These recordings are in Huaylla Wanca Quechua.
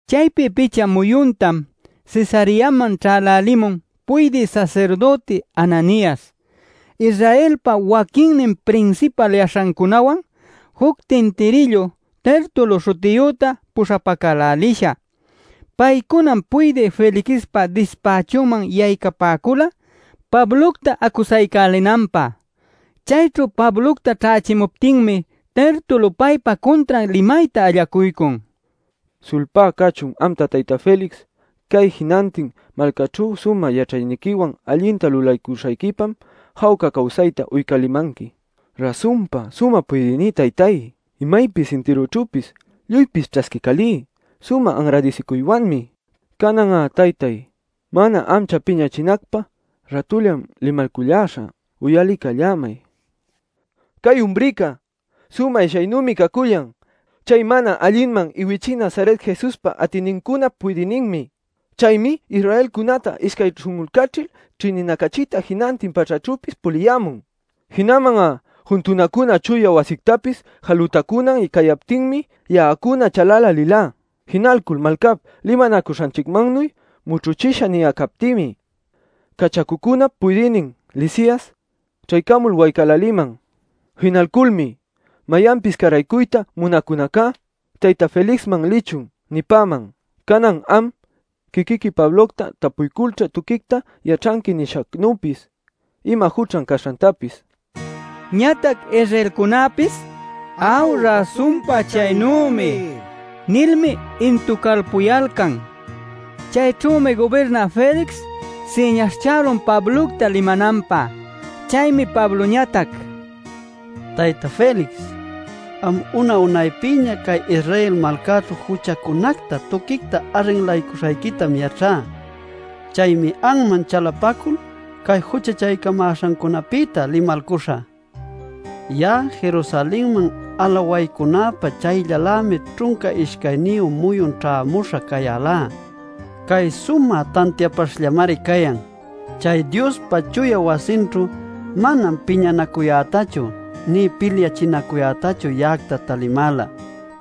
Chaypi picha muyuntam Cesareaman ćhälälimun puydï sasirdüti Ananias, Israelpa waquinnin prinsipal yaśhacunawan juc tintirillu Tertulo śhutiyüta puśhapacälälisha. Paycunam puydï Felixpa dispächunman yaycapäcula Pablocta acusaycälinanpä. Chayćhu Pablocta ćhächimuptinmi Tertulo paypa cuntran limayta allacuycun: “Sulpá cachun amta Tayta Felix. Cay jinantin malcäćhu sumä yaćhayniquiwan allinta lulaycuśhayquipam jawca cawsayta uycälimanqui. Rasunpa, Sumä Puydïní Taytay, imaypis intirućhüpis lluypis ćhasquiycälí sumä anradisicuywanmi. Canan'a Taytay, mana ancha piñachinacpä, rätullam limalculläśhä. Uyaliycallämay. “Cay umrica sumä ishyaynümi cacullan. Chay mana allinman iwichï Nazaret Jesuspa atïnincunap puydïninmi. Chaymi Israelcunäta ishcay śhun'ulcachil ćhïninacachiyta jinantin pachäćhüpis puliyämun. Jinaman'a juntunacuna chuya wasictapis jalutacunan cayaptinmi ya'acuna chalälälilá. ˻Jinalcul malcap limanacuśhanchicmannuy mućhuchisha niyalcaptïmi cachacucunap puydïnin Lisias ćhaycamul waycäläliman. Jinalculmi: ‘Mayanpis cäraycuyta munäcunacá tayta Felixman lichun’ nipäman.˼ Canan am quiquiqui Pablocta tapuyculćha tuquicta yaćhanqui nishacnüpis ima juchan caśhantapis” nil. Ñatac Israelcunäpis: “¡Aw, rasunpa chaynümi!” nilmi intucalpuyalcan. Chayćhümi gubirnä Felix siñaśhchälun Pablocta limananpä. Chaymi Pabloñatac: “Tayta Felix, am una-unaypïña cay Israel malcäćhu juchacunacta tuquicta arrinlaycuśhayquïtam yaćhá. Chaymi anman chalapacul cay juchachaycamäśhancunapïta limalcuśhä. “Ya'a Jerusalenman alawaycunäpä chayllalämi ćhunca ishcayniyu muyun ćhämuśha cayälá. Cay sumä tantiapaśhllamari cayan. Chay Diospa chuya wasinćhu manam piñanacuyätachu nï pilyachinacuyätachu ya'acta talipämäla,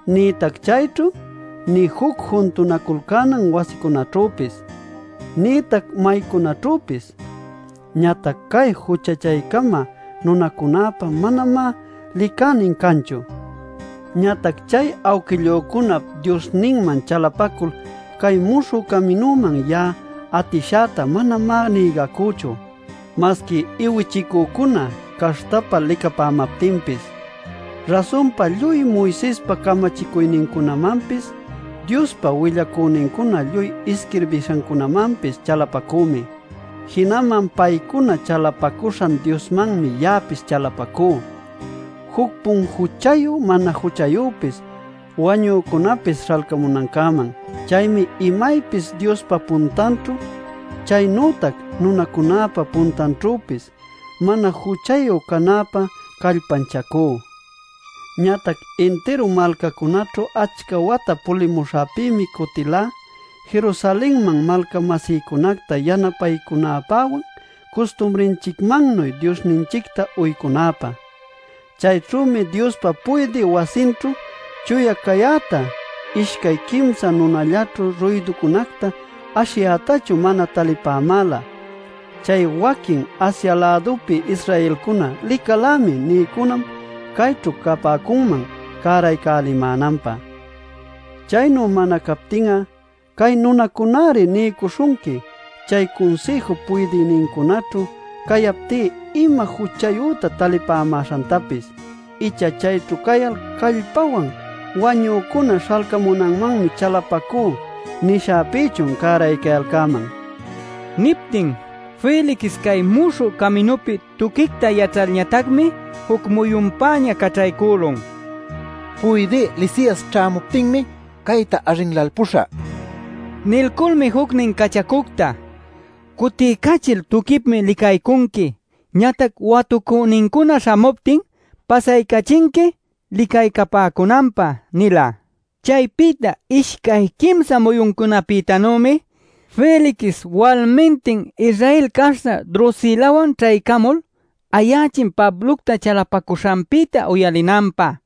nïtac chayćhu, nï juc juntunaculcänan wasicunaćhüpis, nïtac maycunaćhüpis. Ñatac cay juchachaycamä nunacunäpa manamá licänin canchu. “Ñatac chay awquillücunap Diosninman chalapacul cay ‘Muśhü Caminuman’ ya'a atishäta manamá nïgacüchu. Masqui iwichicücuna caśhtapa licapämaptinpis, rasunpa lluy Moisespa camachicuyninmanpis Diospa willacünincuna lluy isquirbishanmanpis chalapacümi. Jinaman paycuna chalapacuśhan Diosmanmi ya'apis chalapacú juc-pun juchayu mana juchayüpis wañücunapis śhalcamunancäman. Chaymi imaypis Diospa puntanćhu chaynütac nunacunäpa puntanćhüpis mana juchayu canäpä callpanchacú. “Ñatac intiru malcacunäćhu achca wata pulimuśhäpïmi cutilá Jerusalenman malca-masïcunacta yanapaycunäpäwan custumrinchicmannuy Diosninchicta uycunäpä. Chayćhümi Diospa puydï wasinćhu chuya cayäta ishcay quimsa nunallaćhu ruyducunacta ashiyätachu mana talipämäla. Chay waquin Asia-lädupi Israelcuna ‘licalämi’ nïcunam cayćhu capäcunman cäraycälimänanpä. Chaynu mana captin'a cay nunacuna-ari niycuśhunqui chay Cunsïjup puydïnincunaćhu cayaptí ima juchayüta talipämäśhantapis. Icha chayćhu cayal callpawan ‘Wañücuna śhalcamunanmanmi chalapacú’ nishäpïchun cäraycayalcäman” nila. Niptin Felix cay Muśhü Caminupi tuquicta yaćhalñatacmi juc muyunpäña caćhaycülun: “Puydï Lisias ćhämuptinmi cayta arrinlalpuśhä” nil. Nilculmi jucnin cachacucta: “Cutiycachil tuquipmi licaycunqui. Ñatac watucünincuna śhamuptin pasaycachinqui licaycapäcunanpä” nila. Chaypïta ishcay quimsa muyuncunapïtanümi Felix walmintin Israel caśhta Drusilawan ćhaycamul ayächin Pablocta chalapacuśhanpïta uyalinanpä.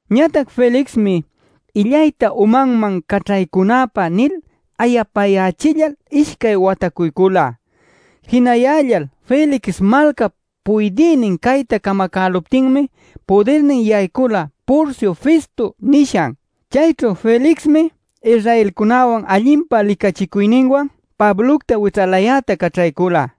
Ñatac Felixmi “Illayta umanman caćhaycunäpä” nil ayapayächillal ishcay watacuycula. Jinayällal Felix malcap puydïnin cayta camacäluptinmi pudirnin yaycula Porcio Festo nishan. Chayćhu Felixmi Israelcunäwan allinpa licachicuyninwan Pablocta wićhalayäta caćhaycüla.